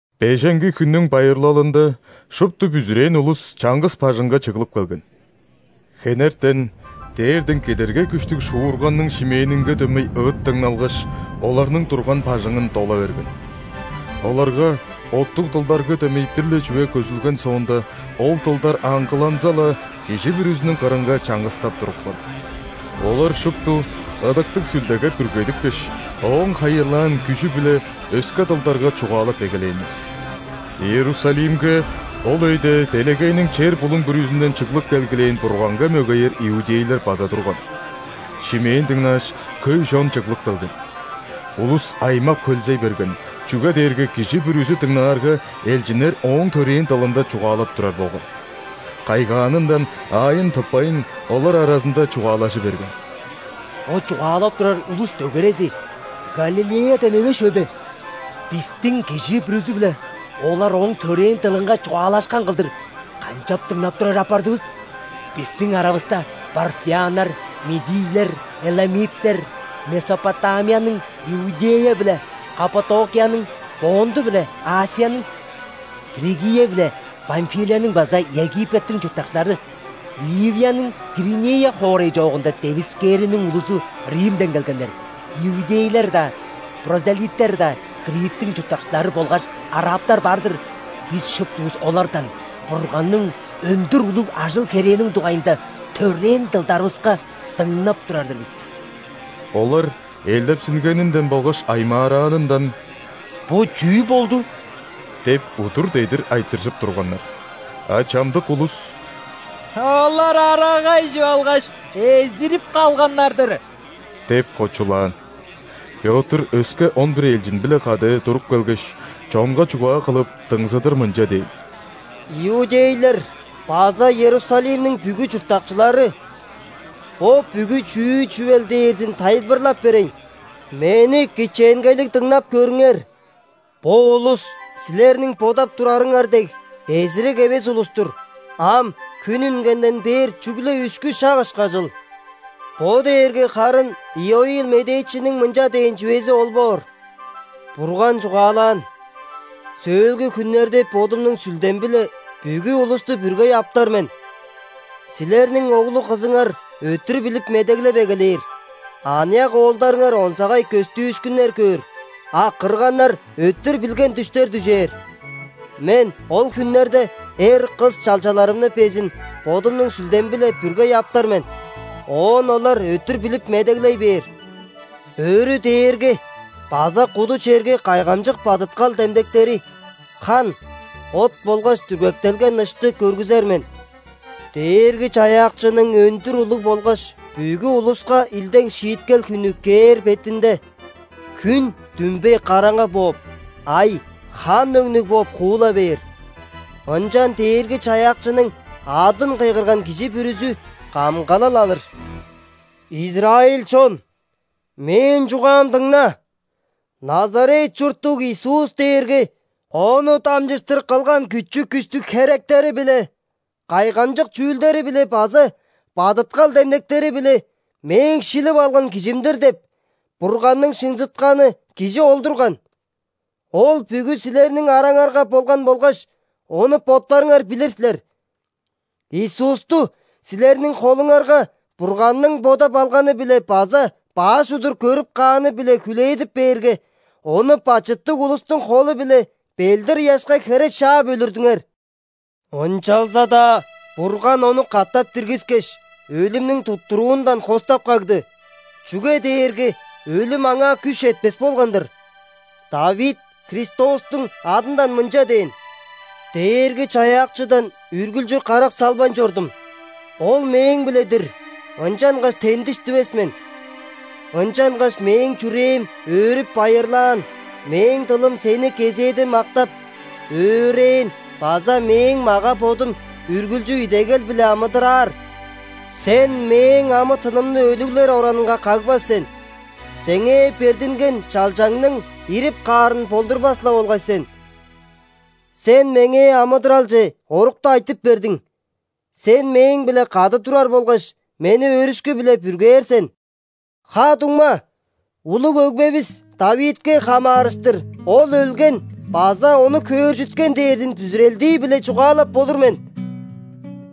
Беженги хүннүң байырлалында шупту бүзүрээн улус чаңгыс бажыңга чыглып келген. Хенертен дээрден кедергей күштүг шуурганның шимээнинге дөмей ыыт дыңналгаш, оларның турган бажыңын дола берген. Оларга оттуг дылдарга дөмей бир-ле чүве көзүлген соонда, ол дылдар аңгыланза-ла, кижи бүрүзүнүң кырынга чаңгыстап турупкан. Олар шупту Ыдыктыг Сүлдеге бүргедипкеш, Ооң хайырлаан күжү-биле өске дылдарга чугаалап эгелээннер. Иерусалимге ол өйде делегейниң чер-булуң бүрүзүнден чыглып келгилээн Бурганга мөгеер иудейлер база турган. Шимээн дыңнааш, хөй чон чыглып келген. Улус аймап-хөлзей берген, чүге дээрге кижи бүрүзү дыңнаарга, элчиннер ооң төрээн дылында чугаалап турар болган. Кайгаанындан аайын тыппайн, олар аразында чугаалажы берген: «Бо чугаалап турар улус дөгерези Галилеядан эвес чүве бе? Бистиң кижи бүрүзү-биле олар ооң төрээн дылынга чугаалашкан кылдыр канчап дыңнап турар апардывыс? Бистиң аравыста парфяннар, мидийлер, эламиттер, Месопотамияның, Иудея биле Каппадокияның, Понт биле ·Асияның, Фригия биле Памфилияның база Египеттиң чурттакчылары, Ливияның Киринея хоорай чоогунда девискээриниң улузу, Римден келгеннер, иудейлер-даа, ·прозелиттер-даа, Криттиң чурттакчылары болгаш арабтар бар-дыр. Бис шуптувус олардан Бурганның өндүр улуг ажыл-херээниң дугайында төрээн дылдарывыска дыңнап турар-дыр бис!» Олар элдепсингенинден болгаш аймаараанындан: «Бо чүү болду?» – деп удур-дедир айтыржып турганнар. А чамдык улус: «Олар арага ижип алгаш, эзирип калганнар-дыр» – деп кочулаан. Пётр өске он бир элчин-биле кады туруп келгеш, чонга чугаа кылып, дыңзыдыр мынча дээн: «Иудейлер база Иерусалимниң бүгү чурттакчылары! Бо бүгү чүү чүвел дээрзин тайылбырлап берейн. Мени кичээнгейлиг дыңнап көрүңер. Бо улус, силерниң бодап турарыңар дег, эзирик эвес улус-тур, ам хүн үнгенден бээр чүгле үшкү шак ышкажыл. Бо дээрге харын Иоил медээчиниң мынча дээн чүвези ол боор: „Бурган чугаалаан:Сөөлгү хүннерде Бодумнуң Сүлдем-биле бүгү улусту бүргей аптар мен.Силерниң оглу-кызыңар өттүр билип медеглеп эгелээр,аныяк оолдарыңар онзагай көстүүшкүннер көөр,а кырганнар өттүр билген дүштер дүжээр. Мен ол хүннерде эр, кыс чалчаларымны безин Бодумнуң Сүлдем-биле бүргей аптар мен,оон олар өттүр билип медеглей бээр. Өрү дээрге база куду черге кайгамчык бадыткал демдектери –хан, от болгаш дүргектелген ышты көргүзер мен. Дээрги-Чаяакчының өндүр улуг болгаш бүгү улуска илдең шииткел хүнү кээр бетинде,хүн дүмбей караңгы бооп, ай хан өңнүг бооп хуула бээр. Ынчан Дээрги-Чаяакчының адын кыйгырган кижи бүрүзү камгалал алыр“. Израиль чон, мээң чугаам дыңна: Назарет чурттуг Иисус дээрге Ону дамчыштыр кылган күчү-күштүг херектери-биле, кайгамчык чүүлдери-биле база бадыткал демдектери-биле „Мээң шилип алган Кижим-дир“ деп Бурганның шынзытканы Кижи ол турган. Ол бүгү силерниң араңарга болган болгаш, ону боттарыңар билир силер. Иисусту силерниң холуңарга Бурганның бодап алганы-биле база баш удур көрүп кааны-биле хүлээдип бээрге, Ону бачыттыг улустуң холу-биле ·белдир-ыяшка хере шаап өлүрдүңер. Ынчалза-даа Бурган Ону катап диргискеш, өлүмнүң туттуруундан хостап кагды, чүге дээрге өлүм Аңаа күш четпес болган-дыр. ·Давид Христостуң адындан мынча дээн:„Дээрги-Чаяакчыдан үргүлчү карак салбайн чордум.Ол мээң-биле-дир, ынчангаш тендиш дивес мен. Ынчангаш мээң чүрээм өөрүп-байырлаан,мээң дылым Сени кезээде мактап, өөрээн базамээң мага-бодум үргүлчү идегел-биле амыдыраар. Сен мээң амы-тынымны өлүглер оранынга кагбас сен,Сеңээ бердинген чалчаңның ирип каарын болдурбас-ла болгай сен! Сен меңээ амыдыралче орукту айтып бердиң,Сен мээң-биле кады турар болгаш, мени өөрүшкү-биле бүргээр сен!“ Ха-дуңма! Улуг өгбевис Давидке хамаарыштыр ол өлген база ону хөөржүткен дээрзин бүзүрелдии-биле чугаалап болур мен.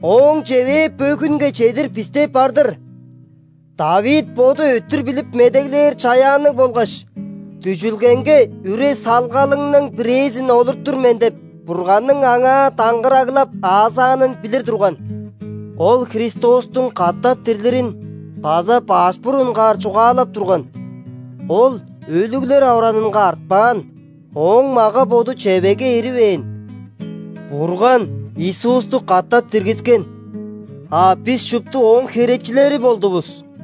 Ооң чевээ бөгүнге чедир бисте бар-дыр. Давид боду өттүр билип медеглээр чаяанныг болгаш, „Дүжүлгеңге үре-салгалыңның бирээзин олуртур мен“ деп Бурганның аңаа даңгыраглап аазаанын билир турган. Ол Христостуң катап дирлирин база баш бурунгаар чугаалап турган: „Ол өлүглер оранынга артпаан, Ооң мага-боду чевегге иривээн“. Бурган Иисусту катап диргискен, а бис шупту ооң херечилери болдувус!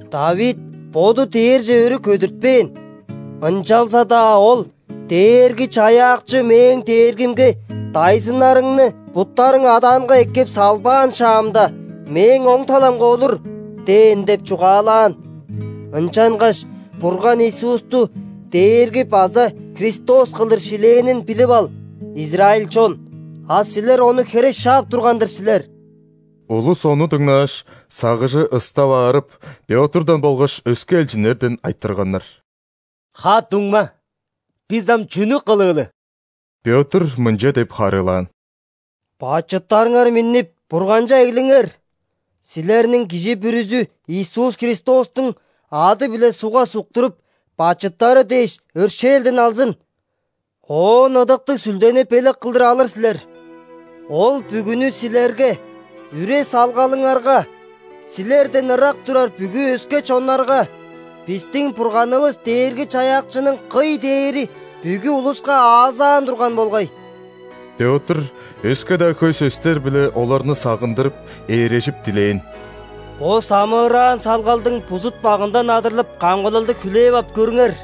Давид боду дээрже өрү көдүртпээн, ынчалза-даа ол:„Дээрги-Чаяакчы мээң Дээргимге:‘Дайзыннарыңны буттарың адаанга эккеп салбаан шаамда,Мээң оң таламга олур’ – дээн“ – деп чугаалаан. Ынчангаш Бурган Иисусту Дээрги база Христос кылдыр шилээнин билип ал, израиль чон! А силер Ону хере шаап турган-дыр силер». Улус ону дыңнааш, сагыжы ыстап аарып, Пётрдан болгаш өске элчиннерден айтырганнар: «Ха-дуңма, бис ам чүнү кылыылы?» Пётр мынча деп харыылаан: «Бачыттарыңар миннип, Бурганче эглиңер. Силерниң кижи бүрүзү Иисус Христостуң ады-биле ·сугга суктуруп, бачыттары дээш, өршээлден алзын, оон Ыдыктыг Сүлдени белек кылдыр алыр силер. Ол бүгүнү силерге, үре-салгалыңарга, силерден ырак турар бүгү өске чоннарга, бистиң Бурганывыс Дээрги-Чаяакчының кый дээри бүгү улуска аазаан турган болгай». Пётр өске-даа хөй сөстер-биле оларны сагындырып, ээрежип дилээн: «Бо самыыраан салгалдың бузут-багындан адырлып, камгалалды хүлээп ап көрүңер!»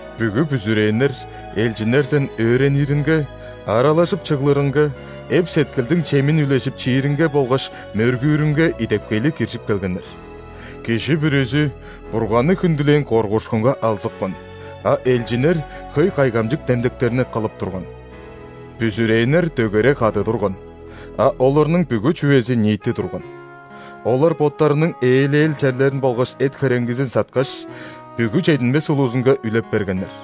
Бүгү бүзүрээннер элчиннерден өөрениринге, аралажып чыглырынга, эп-сеткилдиң чемин үлежип чииринге болгаш мөргүүрүнге идепкейлиг киржип келгеннер. Кижи бүрүзү Бурганны хүндүлээн коргуушкунга алзыпкан, а элчиннер хөй кайгамчык демдектерни кылып турган. Бүзүрээннер дөгере кады турган, а оларның бүгү чүвези ниити турган. Олар боттарының ээлел черлерин болгаш эт-хөреңгизин саткаш, бүгү чединмес улузунга үлеп бергеннер.